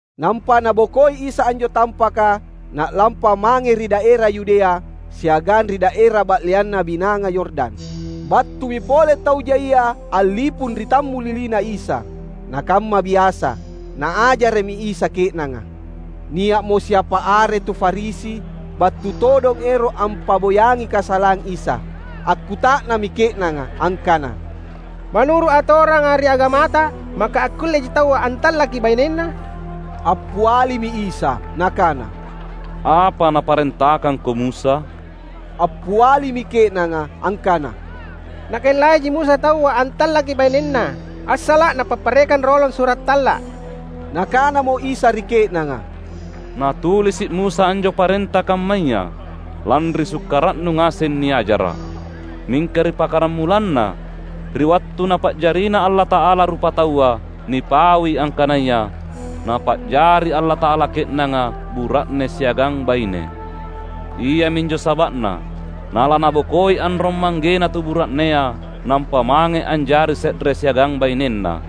Nampa Nabokoi Isa anjo tampaka, Na’lampa mange ri daera Yudea, siagang ri daera ba’leanna Binanga Yordan. Battumi pole tau jaia a’lipung ri tammulilina Isa. Na kamma biasa, Naajara’mi Isa ke’nanga. Nia’mo siapa are tu Farisi battu todong ero’ ampa’boyangi kasalang Isa. Akkuta’nammi ke’nanga angkana, "Manuru’ atoranga ri agamata, maka akkulleji taua antallaki bainenna?" Appialimi Isa Nakana, "Apa naparentakangko Musa?" Appialimi ke’nanga angkana, "Nakellaiji Musa taua antallaki bainenna, assala’ napapparekang rolong sura’ talla’." Nakanamo Isa ri ke’nanga, "Nanatulisi’ Musa anjo parenta kammaya, lanri sukkara’nu ngaseng niajara’. Mingka ri pakkaramulanna, ri wattu Napa’jarina Allata’ala rupataua, nipaui angkanaya, ‘Napa’jari Allata’ala ke’nanga bura’ne siagang baine. Iaminjo saba’na na lanabokoi anrong-manggena tu bura’nea nampa mange anjari se’re siagang bainenna,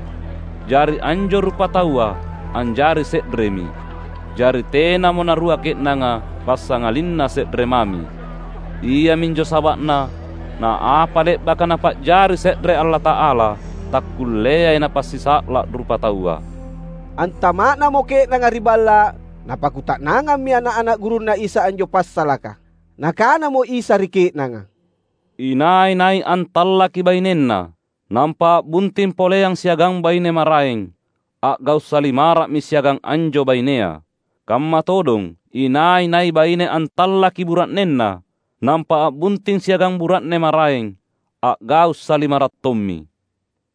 jari anjo rupataua anjari se’remi.’ Jari tenamo narua ke’nanga, passangalinna se’re mami. Iaminjo saba’na, na apa le’baka Napa’jari se’re Allata’ala, takkulleai napasisa’la rupataua!" Antama’namo ke’nanga ri balla’, napakkuta’nangammi ana’-ana’ gurunNa Isa anjo passalaka. Nakanamo Isa ri ke’nanga, "Inai-nai antallaki bainenna, nampa a’bunting poleang siagang baine maraeng, a’gau’ salimara’mi siagang anjo bainea. Kamma todong inai-nai baine antallaki bura’nenna, nampa a’bunting siagang bura’ne maraeng, a’gau’ salimara’ tommi."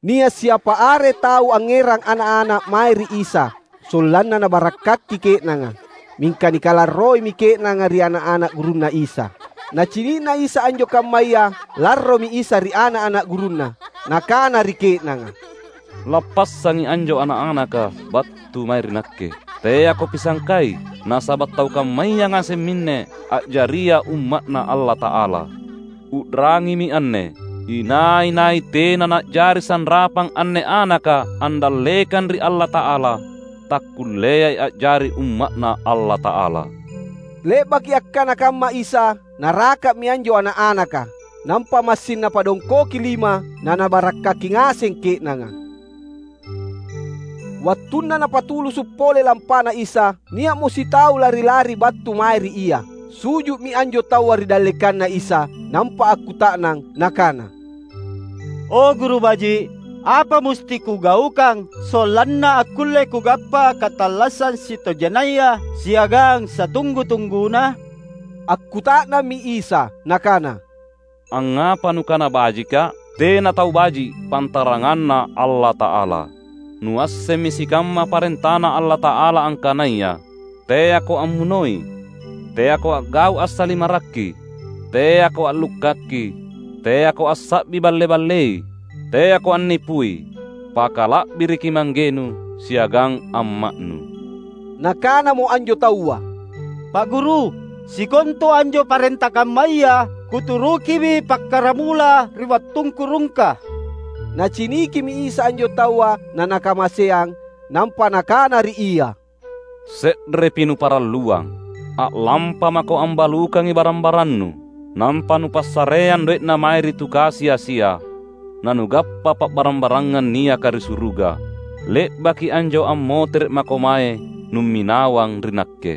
Nia’ siapa are tau angngerang ana’-ana’ mae ri Isa sollanna Nabarakkaki ke’nanga. Mingka nikalarroimi ke’nanga ri ana’-ana’ gurunNa Isa. Nacini’na Isa anjo kammaya, larromi Isa ri ana’-ana’ gurunNa. Nakana ri ke’nanga, "Lappassangi anjo ana’-anaka battu mae ri Nakke! Teako pisangkai, nasaba’ tau kammaya ngaseng minne a’jaria umma’Na Allata’ala. U’rangimi anne! Inai-nai tena na’jari sanrapang anne anaka andallekang ri Allata’ala, takkulleai a’jari umma’Na Allata’ala." Le’baki akkana kamma Isa, Naraka’mi anjo ana’-anaka, nampa massing Napadongkoki lima naNabarakkaki ngaseng ke’nanga. Wattunna Napatulusu’ pole lampaNa Isa, nia’mo sitau lari-lari battu mae ri Ia. Su’ju’mi anjo taua ri dallekanNa Isa nampa akkuta’nang nakana, "O Guru baji’, apa musti kugaukang sollanna akkulle kugappa katallassang sitojennaya siagang satunggu-tungguna?" Akkuta’nammi Isa Nakana, "Angngapa nukana bajikKa’? Tena tau baji’, pantaranganna Allata’ala. Nuassemmi sikamma parentaNa Allata’ala angkanaya, ‘Teako ammunoi; teako a’gau’ assalimarri; teako a’lukkaki; teako assa’bi balle-ballei; teako annipui; pakala’biriki manggenu siagang amma’nu.’" Nakanamo anjo taua, "Pa’ Guru, sikontu anjo parenta kammaya kuturukimi pakkaramula ri wattungku rungka." Nacinikimi Isa anjo taua na Nakamaseang. Nampa Nakana ri ia, "Se’repi nuparalluang. A’lampamako ambalukangi barang-barannu; nampa nupassareang doe’na mae ri tu kasi-asia, nanugappa pa’barang-barangang niaka ri suruga. Le’baki anjo ammotere’ mako mae numminawang ri Nakke."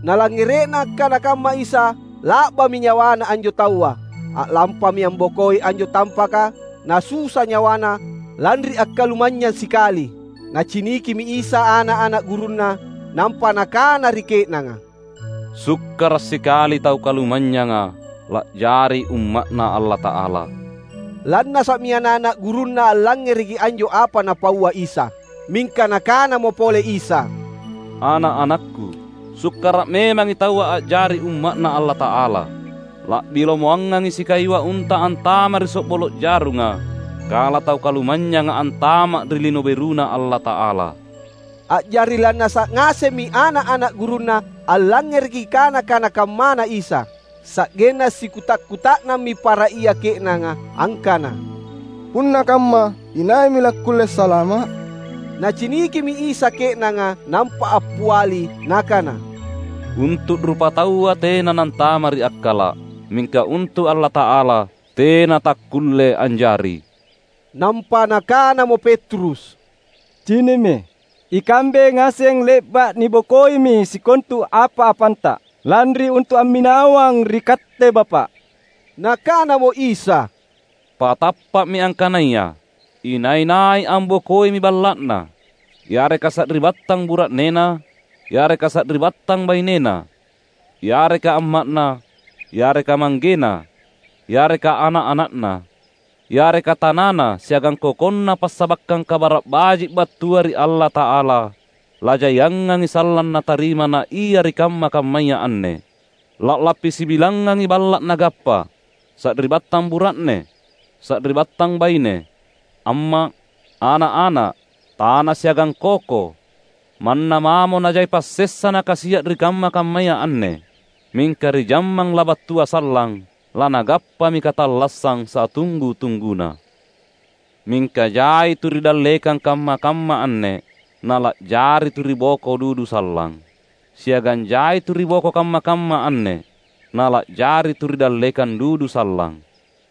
Nalangngere’na akkana kamma Isa, la’bami nyawana anjo taua. A’lampami ambokoi anjo tampaka na susa nyawana lanri akkalumanynyang sikali. Nacinikimi Isa ana’-ana’ gurunNa, nampa Nakana ri ke’nanga, "Sukkara’ sikali tau kalumanynyanga la’jari umma’Na Allata’ala!" Lannasa’mi ana’-ana’ gurunNa allangngereki anjo apa Napaua Isa. Mingka Nakanamo pole Isa, "Ana’-anakKu, sukkara’ memangi taua a’jari umma’Na Allata’ala! La’bi lomoangangi sikayua unta antama’ ri so’bolo’ jarunga kala tau kalumanynyanga antama’ ri Lino BeruNa Allata’ala." A’jari lannasa’ ngasemmi ana’-ana’ gurunNa allangngereki kana-kana kammana Isa. Sa’genna sikuta’-kuta’nammi para ia ke’nanga angkana, "Punna kamma, inaimi lakkulle salama’?" Nacinikimi Isa ke’nanga nampa appiali Nakana, "Untu’ rupataua tena nantama’ ri akkala’; mingka untu’ Allata’ala tena takkulle anjari." Nampa nakanamo Petrus, "Cini’mi, ikambe ngaseng le’ba’ nibokoimi sikontu apa-apanta lanri untu’ amminawang ri Katte Bapa’." Nakanamo Isa, "Patappa’mi angkanaya: inai-nai ambokoimi balla’na, yareka sari’battang bura’nena, yareka sari’battang bainena, yareka amma’na, yareka manggena, yareka ana’-ana’na, yareka tanana siagang kokonna passabakkang Kabara’ Baji’ battua ri Allata’ala, lajaiangangi sallang natarima naia ri kamma-kammaya anne. La’lappi sibilangngangi balla’ nagappa, sari’battang bura’ne, sari’battang baine, amma’, ana’-ana’, tana siagang koko; manna mamo najai passessa nakasia’ ri kamma-kammaya anne. Mingka ri jammang labattua sallang, lanagappami katallassang satunggu-tungguna. Mingka jai tu ri dallekang kamma-kamma anne, nala’jari tu ri boko dudu sallang. Siagang jai tu ri boko kamma-kamma anne, nala’jari tu ri dallekang dudu sallang."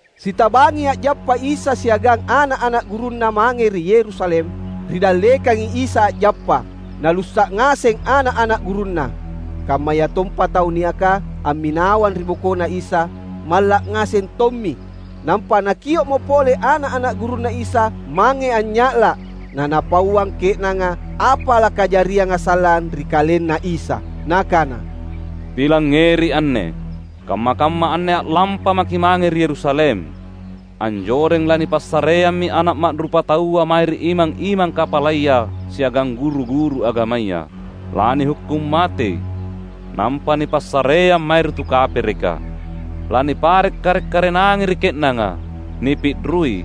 Sitabangi a’jappa Isa siagang ana’-ana’ gurunNa mange ri Yerusalem. Ri dallekangi Isa a’jappa, nalussa’ ngaseng ana’-ana’ gurunNa. Kammayatompa tau niaka amminawang ri bokoNa Isa malla’ ngaseng tommi. Nampa Nakio’mo pole ana’-ana’ gurunNa Isa mange anynya’la’, na Napauang ke’nanga apa lakajarianga sallang ri KalenNa Isa. Nakana, "Pilangngeri anne; kamma-kamma anne a’lampa maki’ mange ri Yerusalem. Anjoreng lanipassareammi Ana’ Ma’rupataua mae ri imang-imang kapalaya siagang guru-guru agamaya. Lanihukkung matei, nampa nipassareang mae ri tu kapereka. Lanipare’ kare’-karenangi ri ke’nanga, nipi’rui,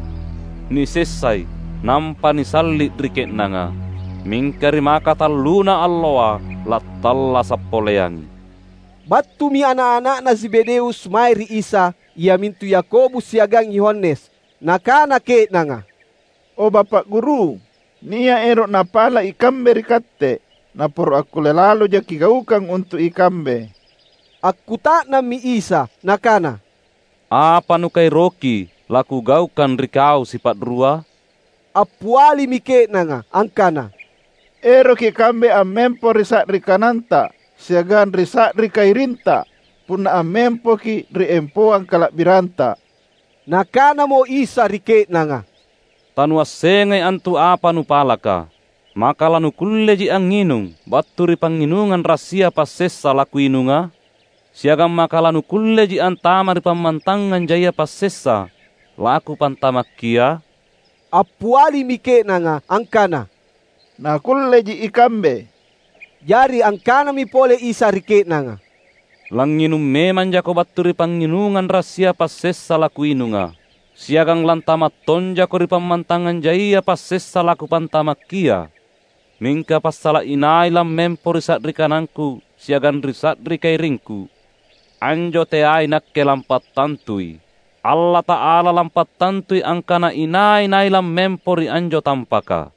nisessai, nampa nisalli’ ri ke’nanga. Mingka ri makatalluna alloa, lattallasa’ poleangi." Battumi ana’-ana’na Zebedeus mae ri Isa, iamintu Yakobus siagang Yohanes. Nakana ke’nanga, "O Bapa’ Guru, nia’ ero’ napala’ ikambe ri Katte, naporo’ akkulle laloja Kigaukang untu’ ikambe." Akkuta’nammi Isa Nakana, "Apa nukaeroki laKugaukang ri kau sipa’rua?" Appialimi ke’nanga angkana, "Eroki kambe ammempo ri sa’ri kananTa siagang ri sa’ri kairinTa punna ammempoKi’ ri empoang kala’biranTa." Nakanamo Isa ri ke’nanga, "Tanuassengai antu apa nupalaka. Maka lanukulleji angnginung battu ri pangnginungang rassia passessa, laKuinunga? Siagang maka lanukulleji antama’ ri pammantangang jaia passessa, laKupantamakkia?" Appialimi ke’nanga angkana, "Nakulleji ikambe." Jari angkanami pole Isa ri ke’nanga, "Langnginung memang jako battu ri pangnginungang rassia passessa laKuinunga. Siagang lantama’ tonjako ri pammantangang jaia passessa laKupantamakkia. Mingka passala’ inai lammempo ri sa’ri kanangKu siagang ri sa’ri kairingKu, anjo teai Nakke lampattantui. Allata’ala lampattantui angkana inai-nai lammempo ri anjo tampaka."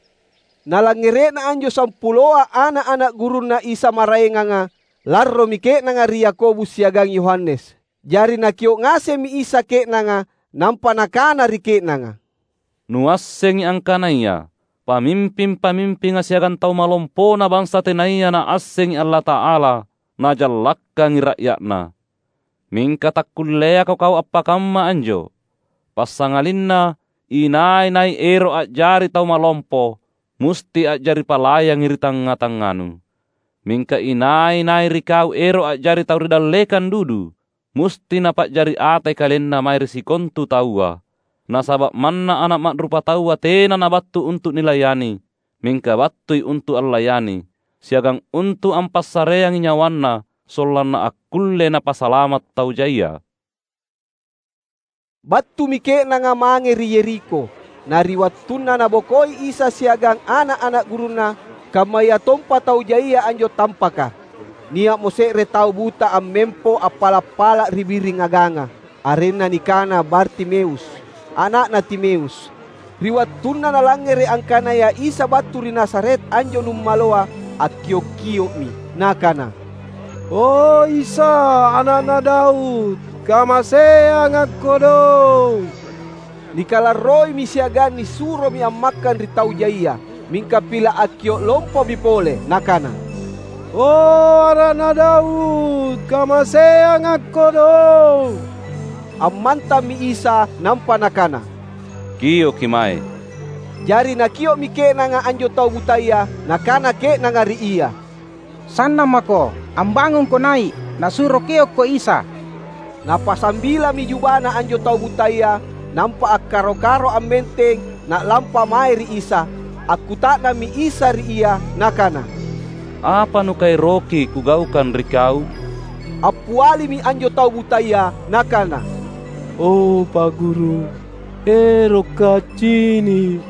Nalangngere’na anjo sampuloa ana’-ana’ gurunNa Isa maraenganga, larromi ke’nanga ri Yakobus siagang Yohanes. Jari Nakio’ ngasemmi Isa ke’nanga, nampa Nakana ri ke’nanga, "Nuassengi angkanaya pamimping-pamimpinga siagang tau malompona bansa tenaya naassengi Allata’ala, najallakkangi ra’ya’na. Mingka takkulleako kau appakamma anjo. Passangalinna inai-nai ero’ a’jari tau malompo musti a’jari palayangi ri tangnga-tangnganu. Mingka inai-nai ri kau ero’ a’jari tau ri dallekang dudu, musti napa’jari atai kalenna mae ri sikontu taua. Nasaba’ manna Ana’ Ma’rupataua tena Nabattu untu’ nilayani. Mingka battui untu’ allayani, siagang untu’ ampassareangi nyawaNa sollanna akkulle Napasalama’ tau jaia." Battumi ke’nanga mange ri Yerikho. Na ri wattunna Nabokoi Isa siagang ana’-ana’ gurunNa, kammayatompa tau jaia anjo tampaka, nia’mo se’re tau buta ammempo appala’-pala’ ri biring aganga. Arenna nikana Bartimeus, ana’na Timeus. Ri wattunna nalangngere’ angkanaya Isa battu ri Nazaret anjo numaloa, akkiok-kio’mi nakana, "O Isa, Ana’na Daud! Kamaseanga’ kodong!" Nikalarroimi siagang nisuromi ammakkang ri tau jaia. Mingka pila’ akkio’ lompomi pole nakana, "O Ana’na Daud, kamaseanga’ kodong!" Ammantammi Isa nampa Nakana, "Kioki mae." Jari nakio’mi ke’nanga anjo tau butaya. Nakana ke’nanga ri ia, "Sannang mako! Ambangungko nai’, Nasuro kiokko Isa!" Napasambilami jubana anjo tau butaya, nampa akkaro-karo ammenteng na’lampa mae ri Isa. Akkuta’nammi Isa ri ia Nakana, "Apa nukaeroki Kugaukang ri kau?" Appialimi anjo tau butaya nakana, "O Pa’ Guru, erokka’ accini’."